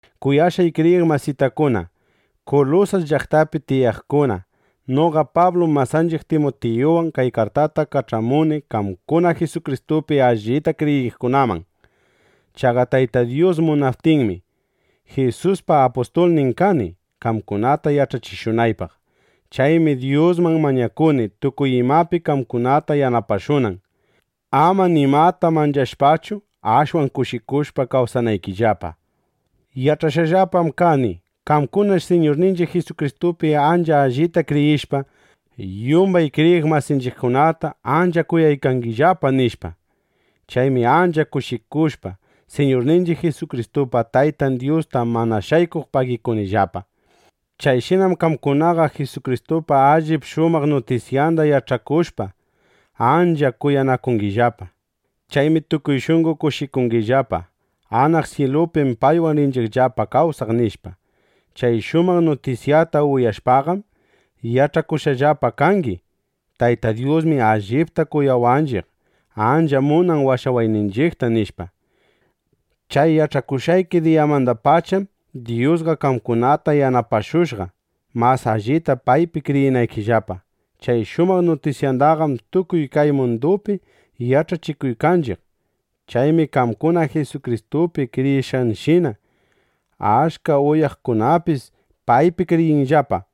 Kuyashqay kriyiq masitakuna Kulusas llaqtapi tiyaqkuna, noqa Pablum masanchiq Timutiyuwan kay kartata kach'amuni qamkuna Jisukristupi allita kriyiqkunaman. Chaqa Tayta Dyus munaptinmi, Jisuspa apustulnin kani, qamkunata yach'achishunaypaq. Chaymi Dyusman mañakuni, tukuy imapi qamkunata yanapashunan, ama nimata manchashpachu, ashwan kushikushpa kawsanaykillapa. Yach'ashqallapam kani: Qamkunash Siñurninchiq Jisukristupi ancha allita kriyishpa, yumbay kriyiq masinchiqkunata ancha kuyaykangillapa, nishpa. Chaymi ancha kushikushpa, Siñurninchiq Jisukristupa Taytan Dyusta mana shaykuq pagikunillapa. Chayshinam qamkunaqa Jisukristupa allip shumaq nutisyanda yach'akushpa, ancha kuyanakungillapa. Chaymi tukuy shunqo kushikungillapa: Anaq syilupim paywan rinchiqllapa kawsaq, nishpa. Chay shumaq nutisyata uyashpaqam, yach'akushqallapa kangi: Tayta Dyusmi allipta kuyawaqninchiq, ancha munan washawayninchiqta, nishpa. Chay yach'akushqayki diyamandapacham Dyusqa qamkunata yanapashushqa, mas allita paypi kriyinaykillapa. Chay shumaq nutisyataqam tukuy kay mundupi yach'achikuykanchiq. Chaymi qamkuna Jisukristupi kriyishqaykishina, achka uyakuqkunapis paypi kriyiykanllapa.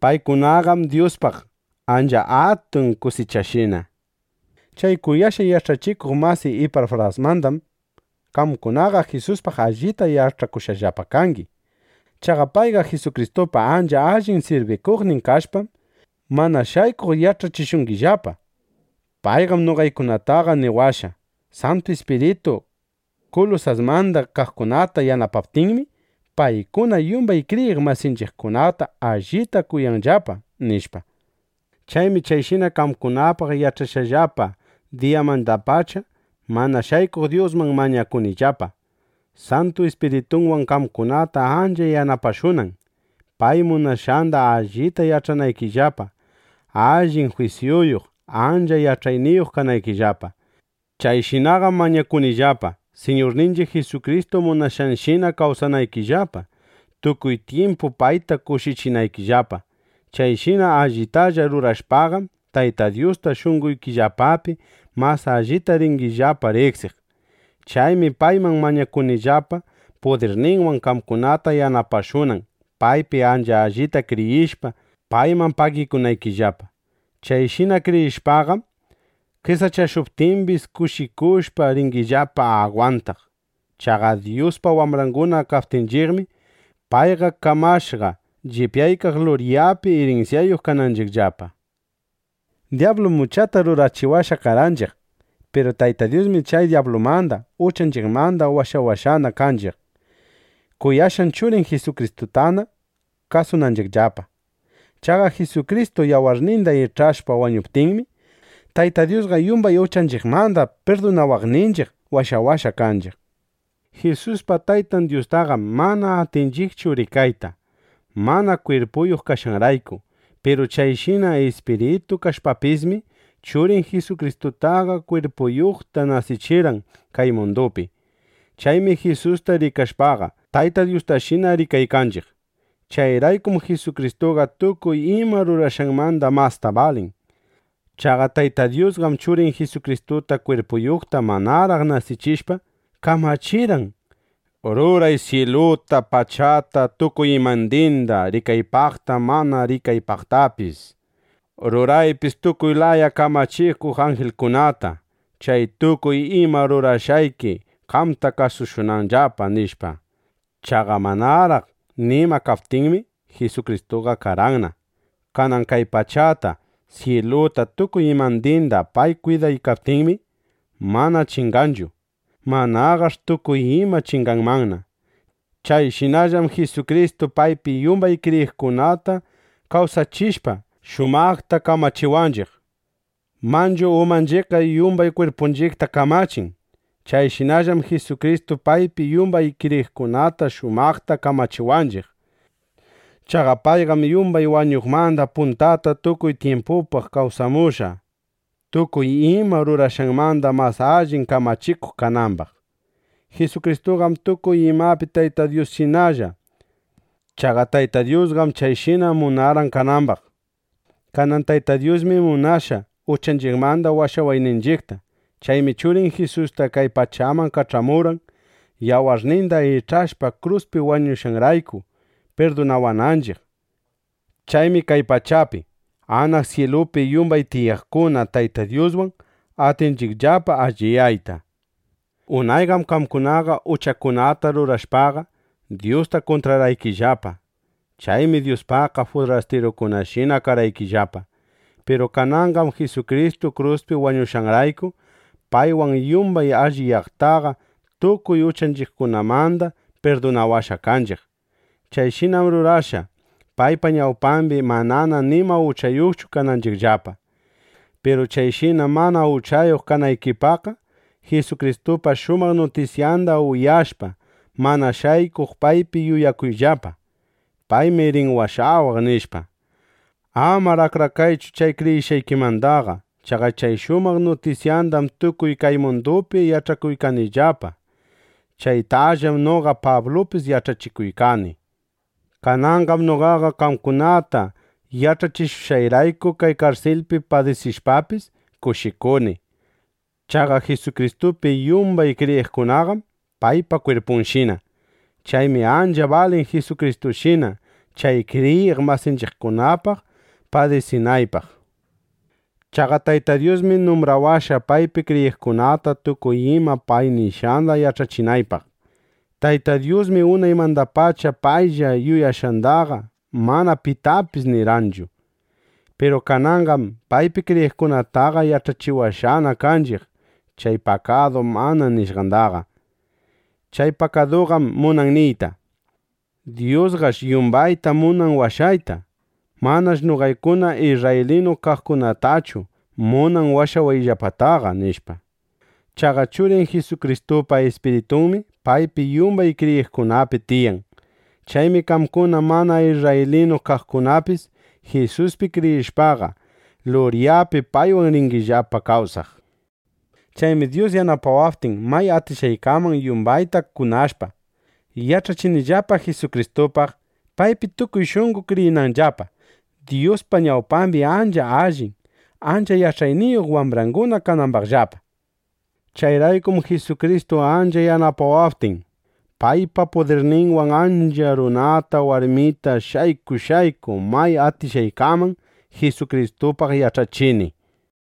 Paykunaqam Dyuspaq ancha atun kusichashina. Chay kuyashqay yach'achikuq masiy Ipafrasmandam qamkunaqa Jisuspaq allita yach'akushqallapa kangi. Chaqa payqa Jisukristupa ancha allin sirbikuqnin kashpam, mana shaykuq yach'achishungillapa. Payqam noqaykunataqa niwashqa: Santu Ispiritu Kulusasmanda kaqkunata yanapaptinmi, paykuna yumbay kriyiq masinchiqkunata allita kuyanllapa, nishpa. Chaymi chayshina qamkunapaq yach'ashqayllapa diyamandapacha, mana shaykuq Dyusman mañakunillapa, Santu Ispiritunwan qamkunata ancha yanapashunan, pay munashqanda allita yach'anaykillapa, allin jwisyuyuq, ancha yach'ayniyuq kanaykillapa. Chayshinaqam mañakunillapa, Siñurninchiq Jisukristu munashqanshina kawsanaykillapa, tukuy tyimpu payta kushichinaykillapa. Chayshina allitalla rurashpaqam, Tayta Dyusta shunqoykillapapi mas allita ringillapa riqsiq. Chaymi payman mañakunillapa, pudirninwan qamkunata yanapashunan, paypi ancha allita kriyishpa, payman pagikunaykillapa. Chayshina kriyishpaqam qesachashuptimbis, kushikushpa ringillapa agwantaq. Chaqa Dyuspa wambranguna kaptinchiqmi, payqa kamashqa, llipyaykaq luryapi irinsyayuq kananchiqllapa. Dyablum uchata rurachiwashqa karqanchiq. Piru Tayta Dyusmi chay dyablumanda, uchanchiqmanda washawashqana kanchiq, kuyashqan Churin Jisukristutana kasunanchiqllapa. Chaqa Jisukristu ˻yawarninda ich'ashpa wañuptinmi,˼ Tayta Dyusqa yumbay uchanchiqmanda pirdunawaqninchiq, washawashqa kanchiq. Jisuspa Taytan Dyustaqam mana atinchiqchu rikayta, mana kwirpuyuq kashqanrayku. Piru chayshina ispiritu kashpapismi, Churin Jisukristutaqa kwirpuyuqta nasichirqan kay mundupi. Chaymi Jisusta rikashpaqa, Tayta Dyustashina rikaykanchiq. Chayraykum Jisukristuqa tukuy ima rurashqanmanda masta balin. Chaqa Tayta Dyusqam Churin Jisukristuta kwirpuyuqta manaraq nasichishpa, kamachirqan: —Ruray syiluta, pachata, tukuy imandinda, rikaypaqta, mana rikaypaqtapis. Ruraypis tukuy laya kamachikuq anjilkunata, chay tukuy ima rurashqayki qamta kasushunanllapa, nishpa. Chaqa, manaraq nima kaptinmi, Jisukristuqa karqanna. Kanan kay pachata, syiluta, tukuy imandinda pay kwidaykaptinmi, mana chinganchu; manaqash' tukuy ima chinganmanna. Chayshinallam Jisukristu paypi yumbay kriyiqkunata kawsachishpa, shumaqta kamachiwanchiq. Manchu umanchiqqa yumbay kwirpunchiqta kamachin. Chayshinallam Jisukristu paypi yumbay kriyiqkunata shumaqta kamachiwanchiq. Chaqa payqam yumbay wañuqmanda puntata tukuy tyimpupaq kawsamushqa, tukuy ima rurashqanmanda mas allin kamachikuq kanambaq. Jisukristuqam tukuy imapi Tayta Dyusshinalla. Chaqa Tayta Dyusqam chayshina munarqan kanambaq. Kanan Tayta Dyusmi munashqa uchanchiqmanda washawayninchiqta. Chaymi Churin Jisusta kay pachaman kach'amurqan, yawarninda ich'ashpa kruspi wañushqanrayku, pirdunawananchiq. Chaymi kay pachapi, anaq syilupi yumbay tiyaqkuna Tayta Dyuswan atinchiqllapa alliyayta. Unayqam qamkunaqa uchakunata rurashpaqa, Dyusta kuntrarqaykillapa. Chaymi Dyuspaqqa furastirukunashina karqaykillapa. Piru kananqam Jisukristu kruspi wañushqanrayku, paywan yumbay alliyaqtaqa tukuy uchanchiqkunamanda pirdunawashqa kanchiq. Chayshinam rurashqa, paypa ñawpambi manana nima uchayuqchu kananchiqllapa. Piru chayshina mana uchayuq kanaykipaqqa, Jisukristupa shumaq nutisyanda uyashpa, mana shaykuq paypi yuyakuyllapa: Paymi rin washawaq, nishpa. Amar akrakaychu chay kriyishqaykimandaqa. Chaqa chay shumaq nutisyandam tukuy kay mundupi yach'achikuykanllapa. Chaytallam noqa Pablupis yach'achikuykani. Kananqam noqaqa qamkunata yach'achishushqayrayku kay karsilpi padisishpapis, kushikuni. Chaqa Jisukristupi yumbay kriyiqkunaqam paypa kwirpunshina. Chaymi ancha balin Jisukristushina chay kriyiq masinchiqkunapaq padisinaypaq. Chaqa Tayta Dyusmi numbrawashqa, paypi kriyiqkunata tukuy ima pay nishqanda yach'achinaypaq. Tayta Dyusmi unaymandapacha paylla yuyashqandaqa mana pitapis nirqanchu. Piru kananqam paypi kriyiqkunataqa yach'achiwashqana kanchiq chay pakadu mana nishqandaqa. Chay pakaduqam munan niyta: Dyusqash yumbayta munan washayta. Manash noqaykuna isrraylinu kaqkunatallachu munan washawayllapataqa, nishpa. Chaqa Churin Jisukristupa Ispiritunmi paypi yumbay kriyiqkunapi tiyan. Chaymi qamkuna mana isrraylinu kaqkunapis Jisuspi kriyishpaqa, luryapi paywan ringillapa kawsaq. Chaymi Dyus yanapawaptin, may atishqaykaman yumbayta kunashpa, yach'achinillapa Jisukristupaq, paypi tukuy shunqo kriyinanllapa, Dyuspa ñawpambi ancha allin, ancha yach'ayniyuq wambranguna kanambaqllapa. Chayraykum Jisukristu ancha yanapawaptin, paypa pudirninwan achka runata, warmita shayku shayku may atishqaykaman Jisukristupaq yach'achini.